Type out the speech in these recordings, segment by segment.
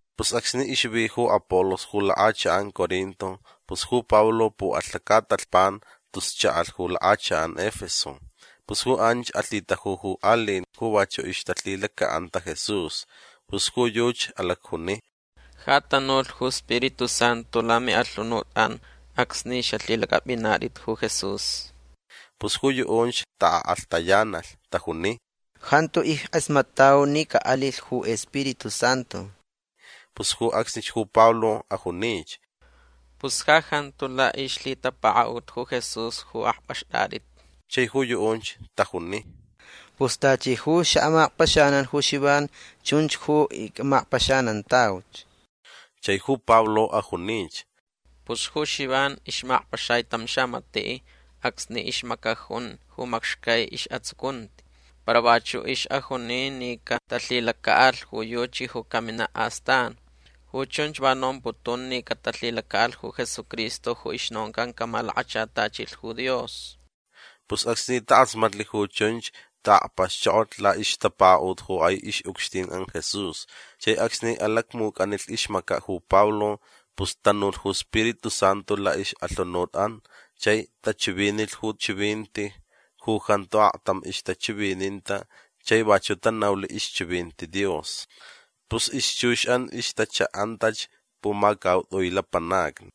Pus acsni ixvi ju Apolos ju lakʼachakʼan Corinto pus ju Pablo puʼalh lacatalhpan tus chaʼalh ju lakʼachakʼan Efeso. Pus ju anch alhitaju ju aliʼin ju vachuʼ ixtalhilacaʼanta Jesús. Pus ju yuchi alacjuni: ―Ja tanulh ju Spiritu Santu lamiʼalhunutʼan acsni xalhilacʼapʼinatʼit ju Jesús. Pus ju yuʼunch taʼakʼalhtayanalh. Tajuni: ―Jantu ickʼasmatʼau ni caʼalilh ju Spiritu Santu. Pus ju acsnich ju Pablo ajunich: ―Pus ja jantu laʼixlhitapakaʼut ju Jesús ju akpʼaxtʼatʼit. Chai ju yuʼunch tajuni: ―Pus tachi ju xaʼamakpaxanan ju Xivan chunch ju icʼamakpaxanantauch. Chai ju Pablo ajunich: ―Pus ju Xivan ixmakpaxai tam xamatiʼ acsni ixmacajun ju macxcai isʼatsucunti. Para vachuʼ ixʼajuni ni catalhilacaʼalh ju yuchi ju caminaʼ astan. Ju chunch va nomputun ni catalhilacaʼalh ju Jesucristo ju ixnoncan camalakachatachilh ju Dios. Pus acsni takʼasmatlh ju chunch taʼakpaxchokolh laʼixtapakaʼut ju kʼai ixʼucxtinʼan Jesús. Chai acsni alacmucʼanilh ixmacaʼ ju Pablo pus tanulh ju Spiritu Santu laʼixʼalhunutʼan chai tachivinilh ju chivinti ju jantu aktam ixtachivininta chai vachuʼ tanaulh ixchivinti Dios. Pus ixchuxʼan ixtachaʼantach pumacautʼui lapanacni.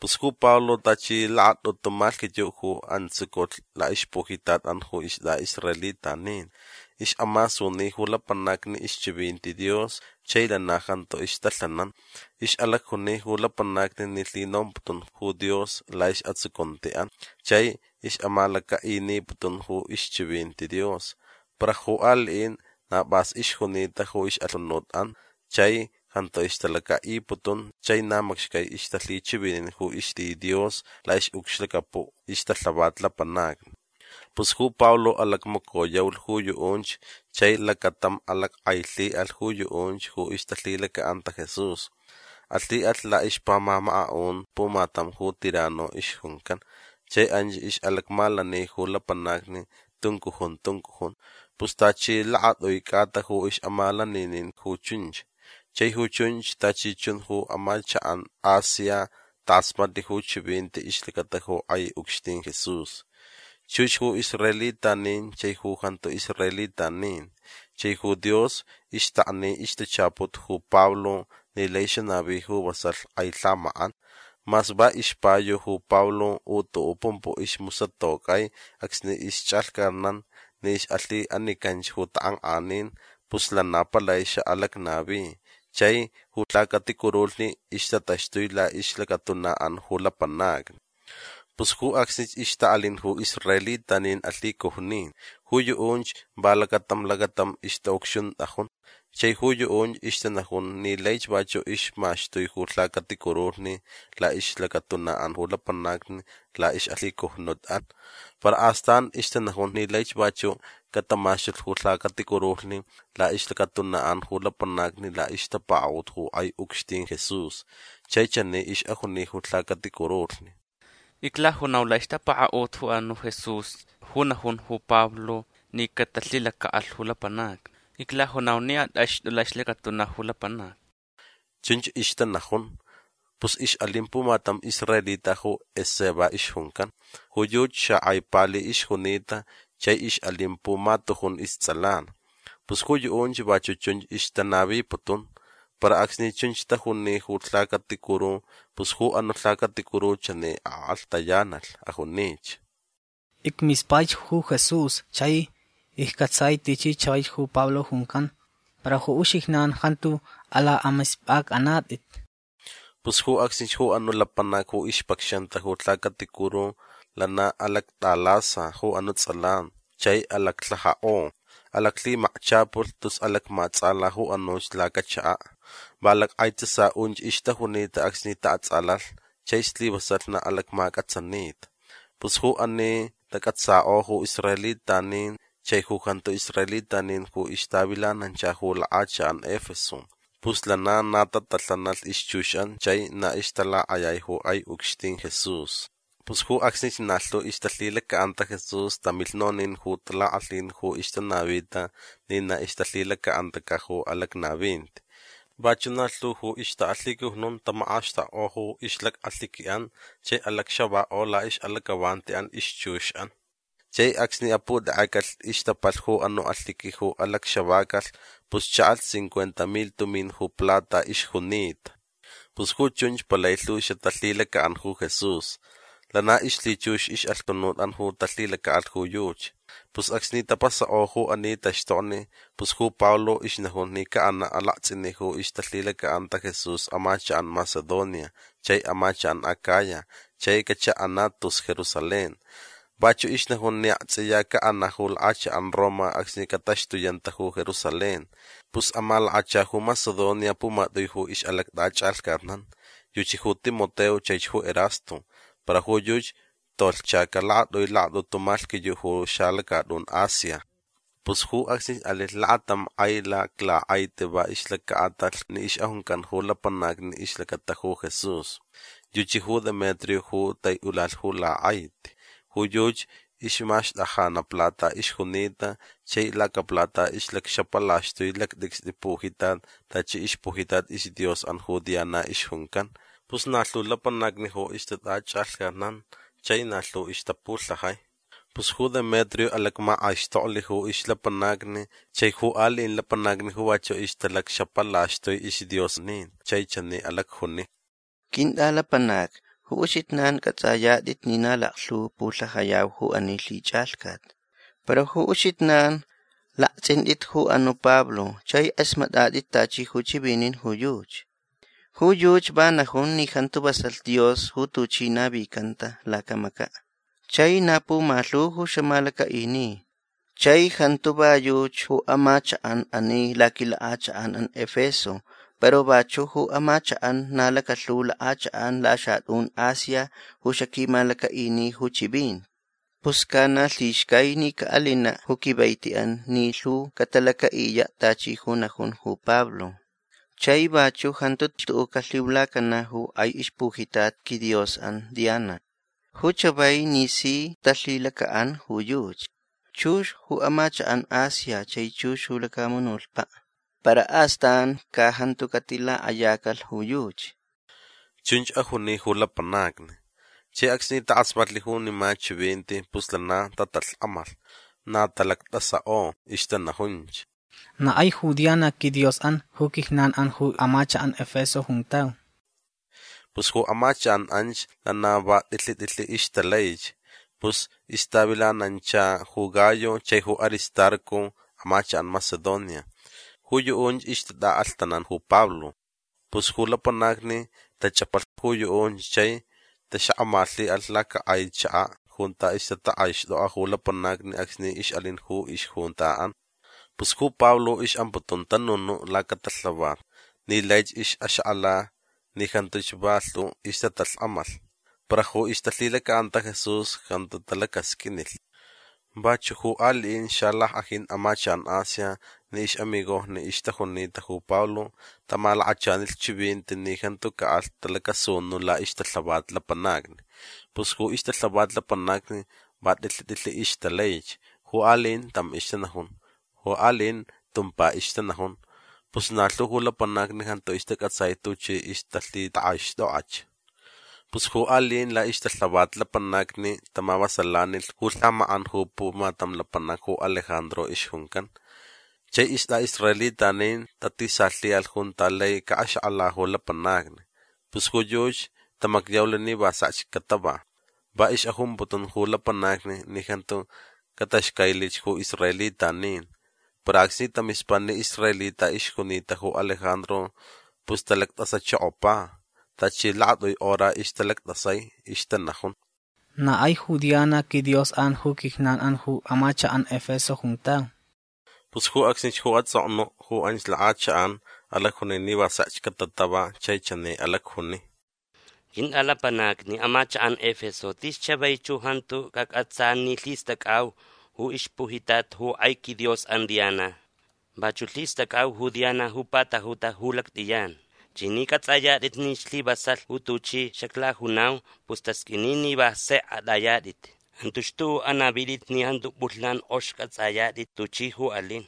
Pus ju Pablo tachi lakatʼutu malhquiyuʼ ju antsuculh laʼixpujitatʼan ju istʼaʼisraelitanin. Ixʼamasuni ju lapanacni ixchivinti Dios chai lana jantu ixtalhanan. Ixʼalacjuni ju lapanacni ni lhinomputun ju Dios laʼisʼatsucuntiʼan. Chai ixʼamalacaʼiniputun ju ixchivinti Dios. Para ju aliʼin na pʼas ixjunita ju ixʼalhunutʼan chai jantu ixtalacaʼiputun chai na macxcai ixtalhichivinin ju ixti Dios laʼixʼucxlacapuʼ ixtalhavat lapanacni. Pus ju Pablo alacmacoyaulh ju yuʼunch chai lacatam alackʼailhiʼalh ju yuʼunch ju ixtalhilacaʼanta Jesús. Alhiʼalh laʼixpamamakaʼun pumatam ju Tiranno ixjuncan. Chai anch ixʼalacmalani ju lapanacni tuncujun tuncujun. Pus tachi lakatʼui cʼata ju ixʼamalaninin ju chunch. Chai ju chunch tachi chun ju amachakʼan Asia takʼasmatlh ju chivinti ixlacata ju kʼai ucxtin Jesús. Chux ju israelitanin chai ju jantu israelitanin. Chai ju Dios ixtakni ixtachaput ju Pablo ni lai xanavi ju vasalh kʼai lhamakʼan. Mas va ixpayu ju Pablo u tuʼuʼ pumpuʼ ju ismusatocʼai acsni ixchʼalhcatnan ni ixʼalhiʼanicanch ju takʼankʼanin pus lana palai xaʼalacnavi. Chai ju lhacaticurulhni ixtataxtui laʼixlacatunaʼan ju lapanacni. Pus ju acsnich ixtaʼalin ju israelitanin alhicujnin. Ju yuʼunch va lacatam lacatam ixtaʼucxuntʼajun. Chai ju yuʼunch ixtanajun ni laich vachuʼ ixmaxtui ju lhacaticurulhni laʼixlacatunaʼan ju lapanacni laʼixʼalhicujnutʼan. Para astan ixtanajun ni laich vachuʼ catamaxtulh ju lhacaticurulhni laʼixlacatunaʼan ju lapanacni laʼixtapakaʼut ju kʼai ucxtin Jesús. Chai chani ixʼajuni ju lhacaticurulhni: ―Iclajunau laʼixtapakaʼut ju anuʼ Jesús ju najun ju Pablo ni catalhilacaʼalh ju lapanacni. Iclajunau ni atʼaxtʼuch laʼixlacatuna ju lapanac. ―Chunch ixtanajun. Pus ixʼalin pumatam israelita ju Esceva ixjuncan. Ju yuchi xakʼai pali ixjunita chai ixʼalin pumatujun istsʼalan. Pus ju yuʼunch vachuʼ chunch ixtanaviputun. Para acsni chunch tajuni ju lhacaticuru pus ju anuʼ lhacaticuru chani akʼalhtayanalh. Ajunich: ―Icmispaich ju Jesús chai iccʼatsai tichi chavaich ju Pablo juncan. Para ju uxijnan jantu alakʼamispʼacʼanatʼit. Pus ju acsnich ju anuʼ lapanac ju ixpacxanta ju lhacaticuru lana alactʼalasa ju anuʼ tsʼalan chai alaclhajakʼo. Alaclhimakchʼapulh tus alacmaʼatsʼala ju anuch lacachakaʼ. Va lackʼaitsasaʼunch ixtajunita acsni taʼatsʼalalh chai slivasalh na alacmacʼatsanita. Pus ju ani tacʼatsakʼo ju israelitanin chai ju jantu israelitanin ju ixtavilanancha ju lakʼachakʼan Efeso. Pus lana na tatalhanalh ixchuxʼan chai na ixtalakʼayai ju kʼai ucxtin Jesús. Pus ju acsnich na lhu ju ixtalhilacaʼanta Jesús tamilh nonin ju talakʼalhin ju ixtanavita ni na ixtalhilacaʼantacaʼ ju alacnavinti. Vachuʼ na lhu ju ixtaʼalhicujnun tamakʼaxtakkʼo ju ixlacʼalhiquiʼan chai alacxavakʼo laʼixʼalacʼavantiʼan ixchuxʼan. Chai acsni aputekʼecalh ixtapalh ju anuʼ alhiqui ju alacxavacalh pus chaʼalh cincuenta milh tumin ju plata ixjunita. Pus ju chunch palai lhu xatalhilacaʼan ju Jesús. Lana ixlhichux ixʼalhunutʼan ju talhilacaʼalh ju yuchi. Pus acsni tapasakʼo ju ani taxtokni pus ju Pablo ixnajun ni caʼanaʼ alaktsʼiniʼ ju ixtalhilacaʼanta Jesús amachakʼan Macedonia chai amachakʼan Acaya chai cachaʼanaʼ tus Jerusalén. Vachuʼ ixnajun ni aktsʼiya caʼanaʼ ju lakʼachakʼan Roma acsni cataxtuyanta ju Jerusalén. Pus amalakacha ju Macedonia pumatʼui ju ixʼalactʼachʼalhcatnan. Yuchi ju Timoteo chaich ju Erasto. Para ju yuchi tolhchacaʼ lakatʼui lakatʼutu malhquiyuʼ ju xalacatʼun Asia. Pus ju acsnich alilh lakatam kʼai laklakʼaiti va ixlacaʼatalh ni ixʼajuncan ju lapanacni ixlacata ju Jesús. Yuchi ju Demetrio ju taiʼulalh ju lakʼaiti. Ju yuchi ixmaxtajanaʼ plata ixjunita chai lacaplata ixlacxapalaxtui lactʼicstʼi pujitat tachi ixpujitat isdiosʼan ju Diana ixjuncan. Pus na lhu lapanacni ju ixtatʼachʼalhcatnan chai na lhu ixtapulhajai. Pus ju Demetrio alacmakʼaixtoklh ju ixlapanacni chai ju aliʼin lapanacni ju vachuʼ ixtalacxapalaxtui isdiosnin chai chani alacjuni: ―Quintʼalapanacni ju uxijnan cʼatsʼayatʼit ni na laklhu pulhajayau ju ani lhichʼalhcat. Para ju uxijnan laktsʼintʼit ju anuʼ Pablo chai kʼasmatʼatʼit tachi ju chivinin ju yuchi. Ju yuchi va najun ni jantu vasalh dios ju tuchi navicanta lacamacaʼ. Chai na pumalhu ju xamalacaʼini. Chai jantu va yuchi ju amachakʼan ani laquilakʼachakʼanʼan Efeso para vachuʼ ju amachakʼan na lakalhu lakʼachakʼan laxatʼun Asia ju xaquimalacaʼini ju chivinti. Pus ca na lhixcai ni caʼalinaʼ ju quivaitiʼan ni lhu catalacaʼiyaʼ tachi ju najun ju Pablo. Chai vachuʼ jantu xtuʼuʼ calhiulacanaʼ ju kʼai ixpujitat quidiosʼan Diana. Ju chavai ni si talhilacaʼan ju yuchi. Chux ju amachakʼan Asia chai chux ju lacamunutpaʼ. Para astan ca jantu catilakʼayacalh ju yuchi. ―Chunch ajuni ju lapanacni. Chai acsni takʼasmatlh junima chivinti pus lana tatalhkʼamalh. Na talactʼasakʼo. Ixtanajunch: ―Na kʼai ju Diana quidiosʼan ju quijnanʼan ju amachakʼan Efeso juntau. Pus ju amachakʼan anch lana va tʼilhi tʼilhi ixtalaich. Pus ixtavilanancha ju Gayo chai ju Aristarco amachakʼan Macedonia. Ju yuʼunch ixtatʼaʼalhtanan ju Pablo. Pus ju lapanacni tachʼapalh ju yuʼunch chai taxakʼamalhiʼalh lacakʼai chakaʼ junta ixtatakʼaixtʼokʼa ju lapanacni acsni ixʼalin ju ixjuntaʼan. Pus ju Pablo ixʼamputun tanunuʼ lacatalhavat ni laich ixʼaxakʼala ni jantuch va lhu ixtatalhkʼamalh para ju ixtalhilacaʼanta Jesús jantu talacasqʼuinilh. Vachuʼ ju aliʼin xalackʼajin amachakʼan Asia ni ixʼamigojni ixtajunita ju Pablo tamalakachanilh chivinti ni jantu caʼalh talacasunuʼ laʼixtalhavat lapanacni. Pus ju ixtalhavat lapanacni va tʼilhi tʼilhi ixtalaich. Ju aliʼin tam ixtanajun. Ju aliʼin tumpa ixtanajun. Pus na lhu ju lapanacni jantu istacʼatsai tuchi ixtalhitakʼaixtʼokʼach. Pus ju aliʼin laʼixtalhavat lapanacni tamavasalanilh ju lhamakʼan ju pumatam lapanac ju Alejandro ixjuncan. Chai ju istʼaʼisraelitanin tatisalhiʼalh junta lai caʼaxakʼala ju lapanacni. Pus ju yuchi tamacyaulh ni va sekch catava. Va ixʼajumputun ju lapanacni ni jantu cataxcailich ju israelitanin. Para acsni tamispa ni israelita ixjunita ju Alejandro pus talactʼasachokopa. Tachi lakatʼui hora ixtalactʼasai. Ixtanajun: ―Na kʼai ju Diana quidiosʼan ju quijnanʼan ju amachakʼan Efeso juntau. Pus ju acsnich ju atsʼoknuʼ ju anch lakʼachakʼan alacjuni ni va sekch catatava chai chani alacjuni: ―Quintʼalapanacni amachakʼan Efeso tis chavaich ju jantu cacʼatsa ni lhistʼacʼau ju ixpujitat ju kʼai quidiosʼan Diana. Vachuʼ lhistʼacʼau ju Diana ju patajuta ju lactʼiyan. Chai ni cʼatsʼayatʼit ni slivasalh ju tuchi xaclajunau pus tasqʼuini ni va sekch atʼayatʼit. Jantu xtuʼuʼ anavitʼit ni jantu pʼulhnan kʼox cʼatsʼayatʼit tuchi ju alin.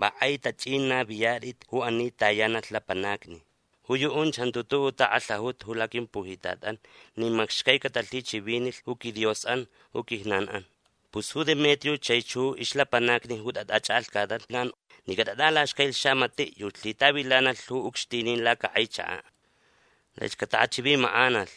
Va kʼai tachʼin naviyatʼit ju ani tayanalh lapanacni. Ju yuʼunch jantu tuʼuʼ takʼalhaʼuta ju laquimpujitatʼan nin macxcai catalhichivinilh ju quidiosʼan ju quijnanʼan. Pus ju Demetrio chaich ju ixlapanacni ju tatʼachʼalhcatnan ni catatʼalaxcailh xamatiʼ yuchi lhitavilanalh ju ucxtinin lacakʼai chakaʼ. Laich cataʼachivimakʼanalh.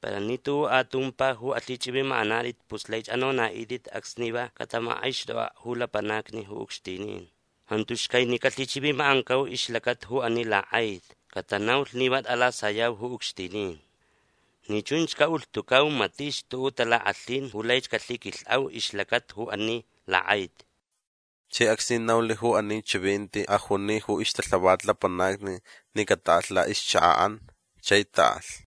Para ni tuʼuʼ atumpa ju alhichʼivimakʼanatʼit pus laich anonaʼitʼit acsni va catamakʼaixtʼokʼaʼ ju lapanacni ju ucxtinin. Jantu xcai ni calhichivimakʼancau ixlacata ju ani lakʼaiti. Catanaulh ni va tʼalasayau ju ucxtinin. Ni chunch caʼulhtucau matich tuʼuʼ talakʼalhin ju laich calhiquilhʼau ixlacata ju ani lakʼaiti. Chai acsni naulh ju ani chivinti ajuni ju ixtalhavat lapanacni ni cataʼalh laʼixchakaʼan. Chai taʼalh.